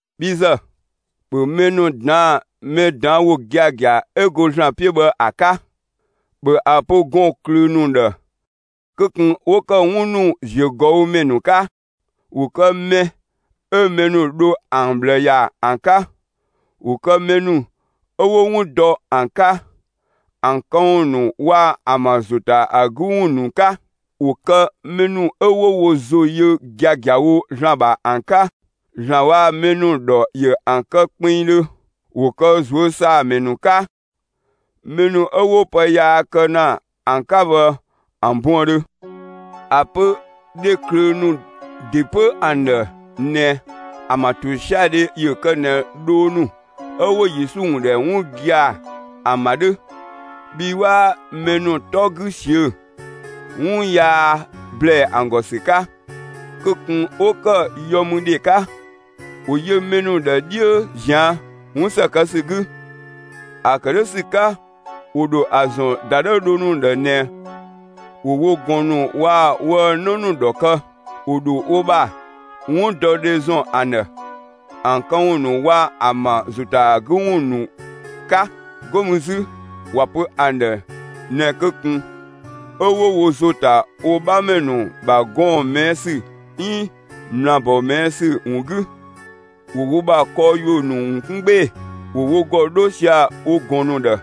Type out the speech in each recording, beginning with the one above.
Bhi ‑zë, ‑bhö mɛ ‑nu ꞊daan'‑ mɛ ꞊daan' ‑wo giagia 'ö go ‑Zlan 'piö bhë ‑a 'ka! ‑Bhö ‑a pö gɔɔn‑ ꞊klöö ‑nu ‑dhë kö ꞊kun 'wo ‑kë 'wun ‑nu ‑ziö ꞊gɔü' ‑mɛ ‑nu 'ka! ‑Wo kë mɛ 'ö mɛ ‑nu dho ‑an ꞊bhlë ‑ya ‑an 'ka! ‑Wo kë mɛ ‑nu 'ö 'wo 'wun dɔ ‑an 'ka, ‑an këwun ‑nu waa‑ ‑an ‑bha ‑zo ‑ta ‑a 'gü ‑wun ‑nu 'ka! ‑Wo kë mɛ ‑nu 'ö 'wo wo ‑zo yö giagiawo ‑Zlan ‑bha ‑an 'ka! ‑Zlan waa‑ mɛ ‑nu ‑dhɔ ‑yö ‑an kë kpinngdhö! ‑Wo kë ꞊zuö' ‑saa ‑mɛ ‑nu 'ka, (mɛ ‑nu 'ö 'wo pë yaa kë ‑na ‑an 'ka bhë ‑an buëndhö)! ‑A pö dhe ꞊klöö ‑nu ‑de 'pö ‑an ‑dhë ꞊nɛ ‑an ‑bha ‑tosiadhe ‑yö kë ꞊nɛ dhoo ‑nu 'ö 'wo Yesu ‑wun ‑dhɛ 'wun gia‑ ‑an ‑bha 'dhö, bhii 'waa mɛ ‑nu 'tɔ 'gü ꞊siö'‑, 'wun yaa ‑blɛɛ ‑an ‑gɔ ‑sü 'ka! Kö ꞊kun 'wo ‑kë yɔmüdhe 'ka! ‑Wo yö mɛ ‑nu ‑dhë 'dhiö ꞊zian' 'wun ‑së kë ‑sü 'gü! ‑A ‑kë 'dhö ‑sü 'ka, ‑wo ‑dho ‑a ‑zɔn ‑dadhëü dhoo ‑nu ‑dhë ꞊nɛ ‑wo wo ꞊gɔn ‑nu waa‑ woë‑ 'në ‑nu ‑dhɔ kë. ‑Wo ‑dho wo ‑bha 'wundɔdhe ‑zɔn ‑an ‑dhë, ‑an këwun ‑nu waa‑ ‑an ‑bha ‑zo ‑ta ‑a 'gü ‑wun ‑nu 'ka. 'Go mü 'zü ‑wa pö ‑an ‑dhë ꞊nɛ kö ꞊kun 'ö 'wo wo ‑zo ta wo 'bhamɛ ‑nu ‑bha gɔɔn‑ ꞊mɛɛ' ‑sü 'iin ꞊mlaabɔ ꞊mɛɛ' ‑sü ‑wun 'gü. ‑Wo wo ‑bha kɔɔ ‑yuö ‑nu ‑wun 'kun 'gbee‑! ‑Wo wo ‑gɔ 'dho sia‑ wo ꞊gɔn ‑nu ‑dhë!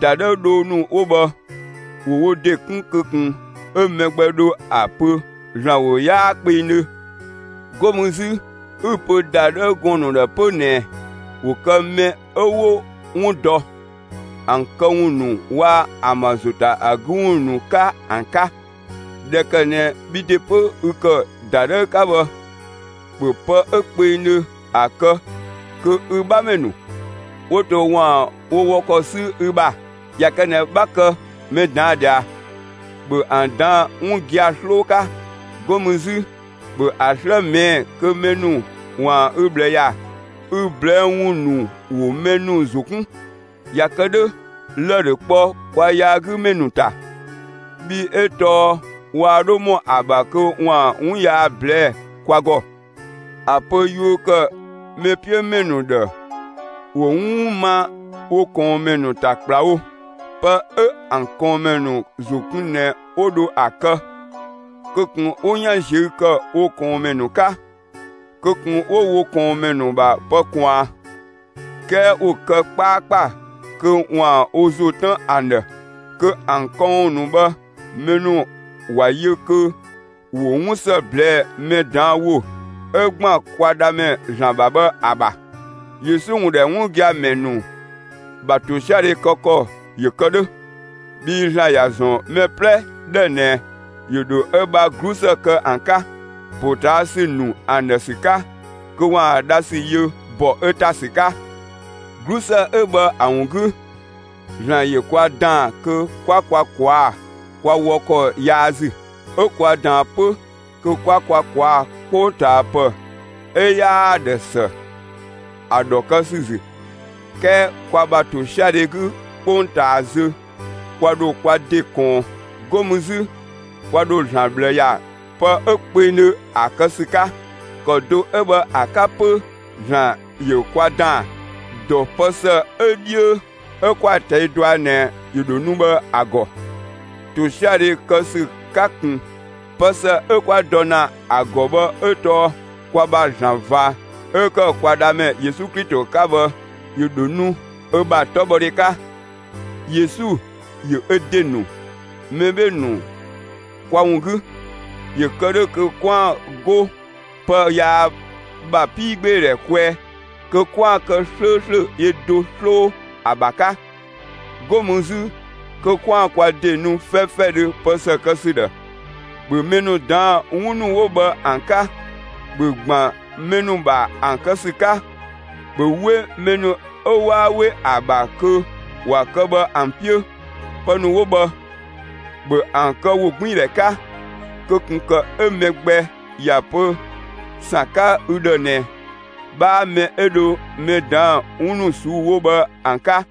‑Dadhëü dhoo ‑nu 'wo bhë, ‑wo wo ‑de 'kun kö ꞊kun 'ö mɛ gbɛ dho ‑a pö ‑Zlan ‑wo 'yaa kpengdhö. 'Go mü 'zü 'ü‑ pö ‑dadhëü gɔɔn‑ ‑nu ‑dhë 'pö ꞊nɛ ‑wo kë mɛ 'ö 'wo 'wun dɔ, ‑an këwun ‑nu waa‑ ‑an ‑bha ‑zo ‑ta ‑a 'gü ‑wun ‑nu 'ka ‑an 'ka! ꞊Dhɛ ‑kë ꞊nɛ bhi ‑de 'pö ü ‑kë ‑dadhëü 'ka bhë, ‑bhö pë 'ö kpengdhö ‑a kë kö ü 'bhamɛ ‑nu 'wo to ‑waan wo wɔ ‑kɔ 'sü ü ‑bha. ꞊Ya kë ꞊nɛ 'bha kë mɛ ꞊daan' ꞊dhia, ‑bhö ‑an ꞊daan' 'wun gia‑ 'sloo 'ka! 'Go mü 'zü, ‑bhö ‑a 'slë ꞊mɛɛ'‑ kö mɛ ‑nu ‑waan ü ꞊bhlë ‑ya! Ü ꞊blɛɛ'‑ ‑wun ‑nu ‑wo mɛ ‑nu ‑zo 'kun! ꞊Ya kë 'dhö, lë‑ ‑dho kpɔ kwa yaagümɛ ‑nu ‑ta, bhii 'ö tɔɔ waa 'dho ‑mɔ ‑a ‑bha kö ‑waan 'wun yaa ꞊blɛɛ'‑ kwa ‑gɔ. ‑A pö yuö ‑kë mɛ 'piö ‑mɛ ‑nu ‑dhë ‑wo 'wun ma wo ꞊kɔɔnmɛ ‑nu ‑ta ‑kplawo! Pë 'ö ‑an ꞊kɔɔnmɛ ‑nu ‑zo kun ꞊nɛ 'wo dho ‑a kë! Kö ꞊kun 'wo 'yan ꞊ziö' ‑kë wo ꞊kɔɔnmɛ ‑nu 'ka! Kö ꞊kun 'wo wo ꞊kɔɔnmɛ ‑nu ‑bha pë ꞊kwaan! 'Kɛɛ ‑wo kë 'kpaakpa kö ‑waan wo ‑zo 'tën ‑an ‑dhë kö ‑an këwun ‑nu bhë mɛ ‑nu ꞊wa yö kö ‑wo 'wun ‑së ꞊blɛɛ'‑ mɛ ꞊daan' ‑wo 'ö ‑gban kwa Dhamɛ ‑Zlan ‑bha bhë ‑a ‑bha. Yesu ‑wun ‑dhɛ 'wun gia‑ ‑mɛ ‑nu ‑bha ‑tosiadhe kë ‑kɔ ‑yö kë 'dhö, bhii ‑Zlan ‑ya ‑zɔn mɛ 'plɛ ‑dhë ꞊nɛ ‑yö ‑dho ö ‑bha 'glusë kë ‑an 'ka, ‑potaasü ‑nu ‑an ‑dhë ‑sü 'ka, kö ‑waan dha ‑sü yö ‑bɔ ö ‑ta ‑sü 'ka. 'Glusë 'ö bhë ‑a ‑wun 'gü, ‑Zlan ‑yö kwa ‑daan kö 'kwa kwa ꞊kwaa'‑ kwa wɔ ‑kɔ yaa ‑zü, 'ö kwa ꞊daan 'pö kö 'kwa kwa ꞊kwaa'‑ 'kpongtaapë 'ö 'yaa‑ ‑dhë ‑së, ‑a ‑dhɔ kë ‑sü ‑zü. 'Kɛɛ kwa ‑bha ‑tosiadhe 'gü 'kpongtaa zö kwa ‑dho kwa ‑de ꞊kɔɔn. 'Go mü 'zü kwa ‑dho ‑Zlan ꞊bhlë ‑ya pë 'ö kpengdhö ‑a kë ‑sü 'ka. ‑Kɔ do 'ö bhë ‑a 'ka 'pö ‑Zlan ‑yö kwa ‑daan, ‑dɔ pë ‑së 'ö 'dhiö 'ö 'kwa‑ ꞊tɛi' dɔa ꞊nɛ ‑yö ‑dho nu bhë ‑a ‑gɔ, ‑tosiadhe ‑kë ‑sü 'ka ꞊kun. Pë ‑së 'ö 'kwa dɔ ‑na ‑a ‑gɔ bhë 'ö tɔɔ kwa ‑bha ‑Zlan ꞊va 'ö ‑kë kwa Dhamɛ Yesu Klito 'ka bhë, ‑yö ‑dho nu ö ‑bha 'tɔbhɔdhe 'ka. Yesu ‑yö ö ‑de ‑nu mɛ 'bhee‑ ‑nu kwa ‑wun 'gü, ‑yö kë 'dhö kö 'kwaan‑ 'go pë yaa ‑bha 'piigbeedhɛ kwɛɛ kö 'kwaan‑ kë 'slööslö yö do 'sloo ‑a ‑bha 'ka, 'go mü 'zü kö 'kwaan‑ kwa ‑de nu 'fɛfɛdhö pë ‑së kë ‑sü ‑dhë. ‑Bhö mɛ ‑nu ꞊daan'‑ 'wun ‑nu 'wo bhë ‑an 'ka! ‑Bhö ‑gban mɛ ‑nu ‑bha ‑an kë ‑sü 'ka! ‑Bhö 'we mɛ ‑nu 'ö 'waa 'we ‑a ‑bha kö ‑wa kë bhë ‑an 'piö. Pë ‑nu 'wo bhë, ‑bhö ‑an kë ‑wogbiindhɛ 'ka! Kö ꞊kun ‑kë 'ö mɛ gbɛ ‑ya pö ‑san 'ka ü ‑dhë ꞊nɛ 'bhaa mɛ 'ö dho mɛ ꞊daan' 'wun ‑nu ꞊suu'‑ 'wo bhë ‑an 'ka!